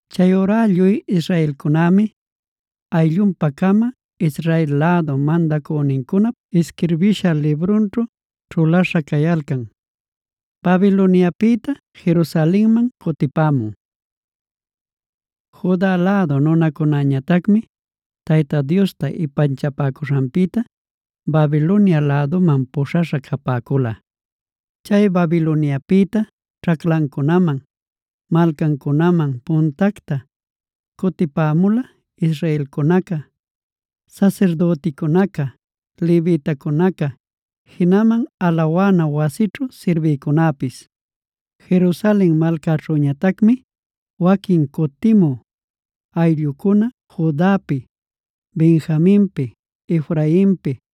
Chayurá lluy israelcunämi ayllunpa-cama Israel lädu mandacünincunap isquirbisha librunćhu ćhulaśha cayalcan. Babiloniapïta Jerusalenman cutipämun Juda lädu nunacunäñatacmi Tayta Diosta ipanchapäcuśhanpïta Babilonia läduman puśhaśha capäcula. Chay Babiloniapïta ćhaclancunaman, malcancunaman puntacta cutipämula israelcunaca, sasirdüticunaca, levitacunaca, jinaman alawana wasićhu sirbïcunäpis. Jerusalen malcaćhüñatacmi waquin cutimü ayllucuna Judapi, Benjaminpi, Efrainpi,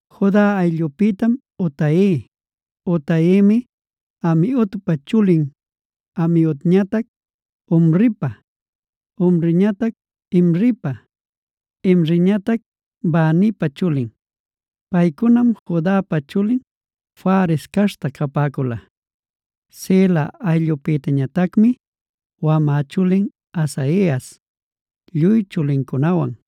Juda ayllupïtam Utai. Utaimi Amiudpa chulin, Amiudñatac Omripa, Omriñatac Imripa, Imriñatac Banipa chulin. Paycunam Judapa chulin Fares caśhta capäcula. Sela ayllupïtañatacmi: wamä chulin Asaias lluy chulincunawan.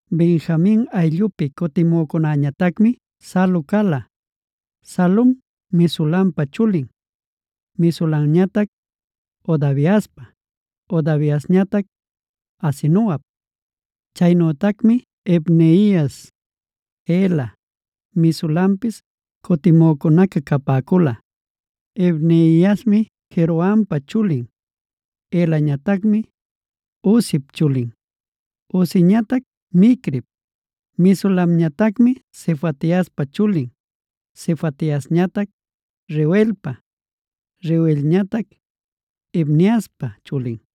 Benjamin ayllupi cutimücunäñatacmi Salu cala. Salum Mesulampa chulin, Mesulamñatac Hodaviaspa, Hodaviasñatac Asenuap. Chaynütacmi Ibneias, Ela, Mesulanpis cutimücunaca capäcula. Ibneiasmi Jerohampa chulin. Elañatacmi Uzip chulin, Uziñatac Micrip. Mesulamñatacmi Sefatiaspa chulin, Sefatiasñatac Reuelpa, Reuelñatac Ibniaspa chulin.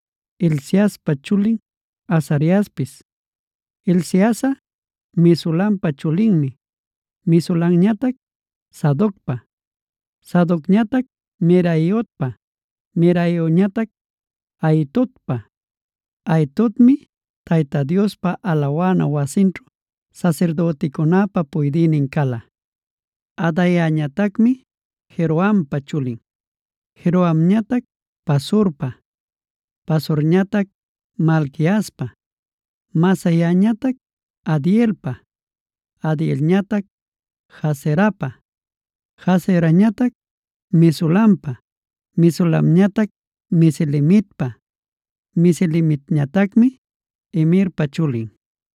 Hilciaspa chulin Azariaspis. Hilciasꞌa Mesulampa chulinmi, Mesulamñatac Sadocpa, Sadocñatac Meraiotpa, Meraiotñatac Ahitobpa. Ahitobmi Tayta Diospa alawana wasinćhu sasirdüticunäpa puydïnin cala. Adaiañatacmi Jerohampa chulin, Jerohamñatac Pasurpa, Pasurñatac Malquiaspa, Masaiñatac Adielpa, Adielñatac Jazerapa, Jazerañatac Mesulampa, Mesulamñatac Mesilemitpa, Mesilemitñatacmi Imerpa chulin.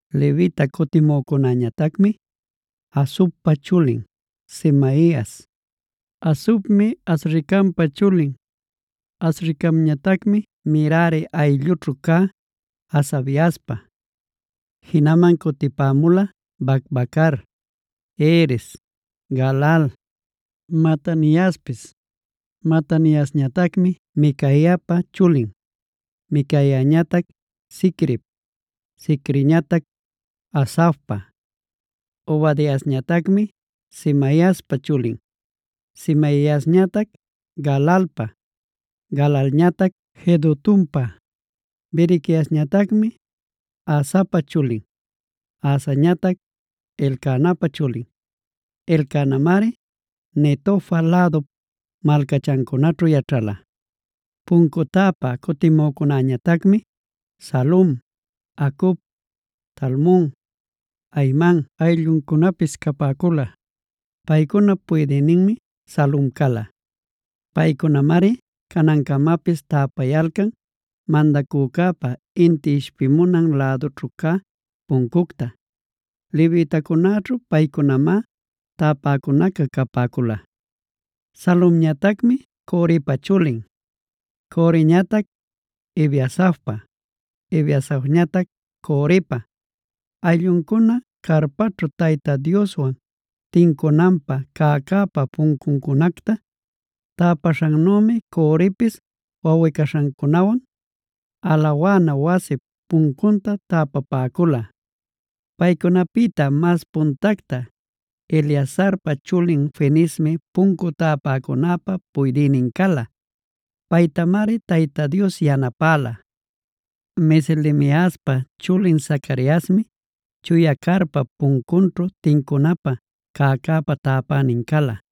Levita cutimücunäñatacmi: Hasubpa chulin Semaias. Hasubmi Azricampa chulin, Azricamñatacmi Merari ayllućhu cä Hasabiaspa. Jinaman cutipämula Bacbacar, Heres, Galal, Mataniaspis. Mataniasñatacmi Micaiapa chulin, Micaiañatac Zicrip, Zicriñatac Asafpa. Obadiasñatacmi Semaiaspa chulin, Semaiasñatac Galalpa, Galalñatac Jedutunpa; Berequiasñatacmi Asapa chulin, Asañatac Elcanapa chulin; Elcanamari Netofa lädup malcachancunaćhu yaćhala. Puncu täpä cutimücunäñatacmi: Salum, Acub, Talmon, Ahiman aylluncunapis capäcula. Paycunap puydïninmi Salum cala. Paycunamari canancamapis täpayalcan mandacücäpa inti ishpimunan lädućhu cä puncunta. Levitacunäćhu paycunamá täpacunaca capäcula. Salumñatacmi Corepa chulin, Coreñatac Ebiasafpa, Ebiasafñatac Corepa. Aylluncuna carpaćhu Tayta Dioswan tincunanpä cäcäpa puncuncunacta täpaśhannümi Corepis wawꞌi-caśhancunawan alawana wasip puncunta täpapäcula. Paycunapïta mas puntacta Eleazarpa chulin Fineesmi puncu täpäcunäpa puydïnin cala. Paytamari Tayta Dios yanapäla. Meselemiaspa chulin Zacariasmi chuya carpap puncunćhu tincunapä cäcäpa täpänin cala.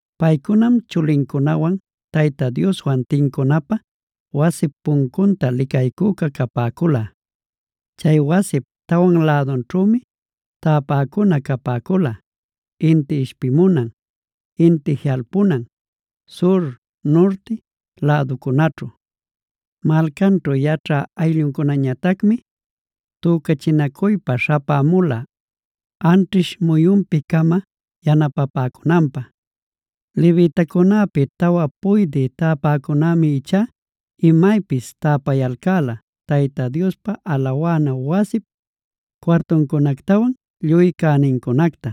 Paycunam chulincunawan Tayta Dioswan tincunapä wasip puncunta licaycüca capäcula. Chay wasip tawan lädunćhümi täpäcuna capäcula: Inti ishpimunan, inti jiꞌalpunan, sur, nurti läducunaćhu. Malcanćhu yaćhä aylluncunañatacmi tücachinacuypa śhapämula anćhish muyunpi-cama yanapapäcunanpä. Levitacunäpi tawa puydï täpäcunämi ichá imaypis täpayalcäla Tayta Diospa alawana wasip cuartuncunactawan lluy cänincunacta.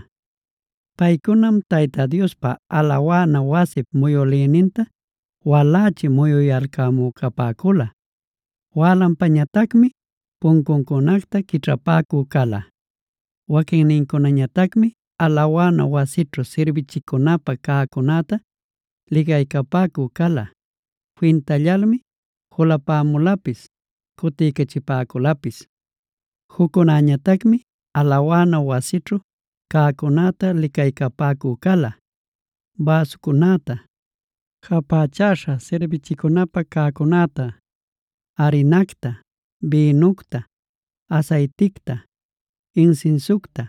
Paycunam Tayta Diospa alawana wasip muyülïninta walächi muyuyalcämü capäcula; wälanpañatacmi puncuncunacta quićhapäcü cala. Waquinnincunañatacmi alawana wasićhu sirbichicunapä cäcunäta licaycapäcü cala; fintallalmi julapämulapis cutiycachipäculapis. Juccunäñatacmi alawana wasićhu cäcunäta licaycapäcü cala: bäsucunäta, japächaśha sirbichicunapä cäcunäta, arinacta, bïnucta, asayticta, insinsiucta,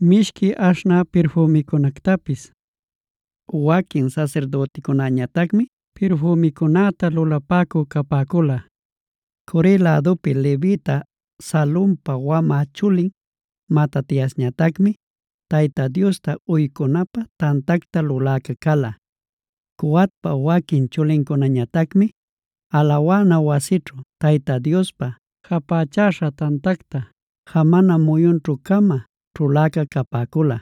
mishqui aśhnä pirfümicunactapis. Waquin sasirdüticunäñatacmi pirfümicunäta lulapäcü capäcula. Core lädupi levita Salumpa wamä chulin Matatiasñatacmi Tayta Diosta uycunanpä tantacta luläca cala. Coatpa waquin chulincunañatacmi alawana wasićhu Tayta Diospa japächäśha tantacta jamana muyunćhu-cama ćhuläca capäcula.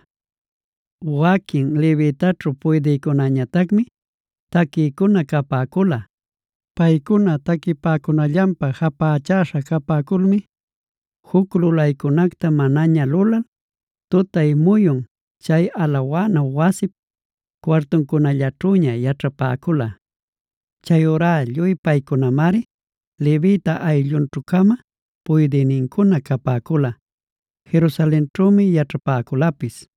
Waquin levitaćhu puydïcunäñatacmi taquïcuna capäcula. Paycuna taquipäcunallanpä japächäśha capäculmi juc lulaycunacta manaña lulal, tutay muyun chay alawana wasip cuartuncunallaćhüña yaćhapäcula. Chayurá lluy paycunamari levita ayllunćhu-cama puydïnincuna capäcula; Jerusalenćhümi yaćhapäculapis.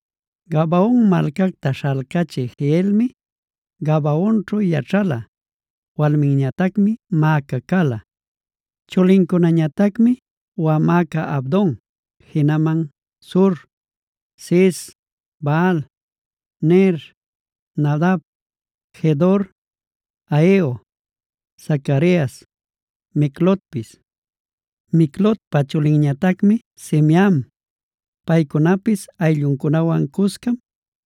Gabaon malcacta śhalcachï Jehielmi Gabaonćhu yaćhala; walminñatacmi Maaca cala. Chulincunañatacmi: wamäca Abdon, jinaman Zur, Cis, Baal, Ner, Nadab, Gedor, Ahio, Zacarias, Miclotpis. Miclotpa chulinñatacmi Simeam. Paycunapis aylluncunawan cuscam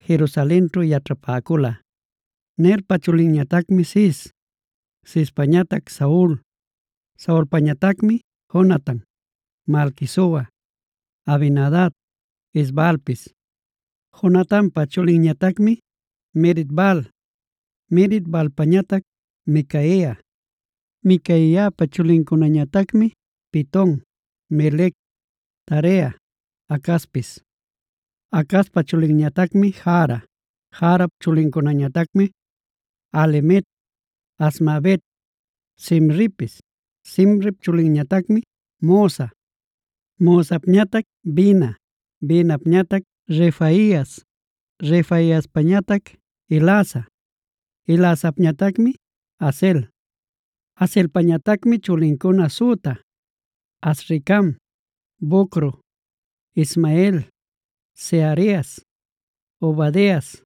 Jerusalenćhu yaćhapäcula. Nerpa chulinñatacmi Cis, Cispañatac Saul, Saulpañatacmi: Jonatan, Malquisua, Abinadab, Es-baalpis. Jonatanpa chulinñatacmi Merib-baal, Merib-baalpañatac Micaia. Micaiapa chulincunañatacmi: Piton, Melec, Tarea, Acazpis. Acazpa chulinñatacmi Jara. Jarap chulincunañatacmi: Alemet, Azmavet, Zimripis. Zimrip chulinñatacmi Mosa. Mosapñatac Bina, Binapañatac Refaias, Refaiaspañatac Elasa, Elasapñatacmi Azel. Azelpañatacmi chulincuna süta: Azricam, Bocru, Ismael, Searias, Obadias,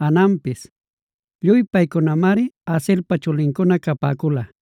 Hananpis. Lluy paycunamari Azelpa chulincuna capäcula.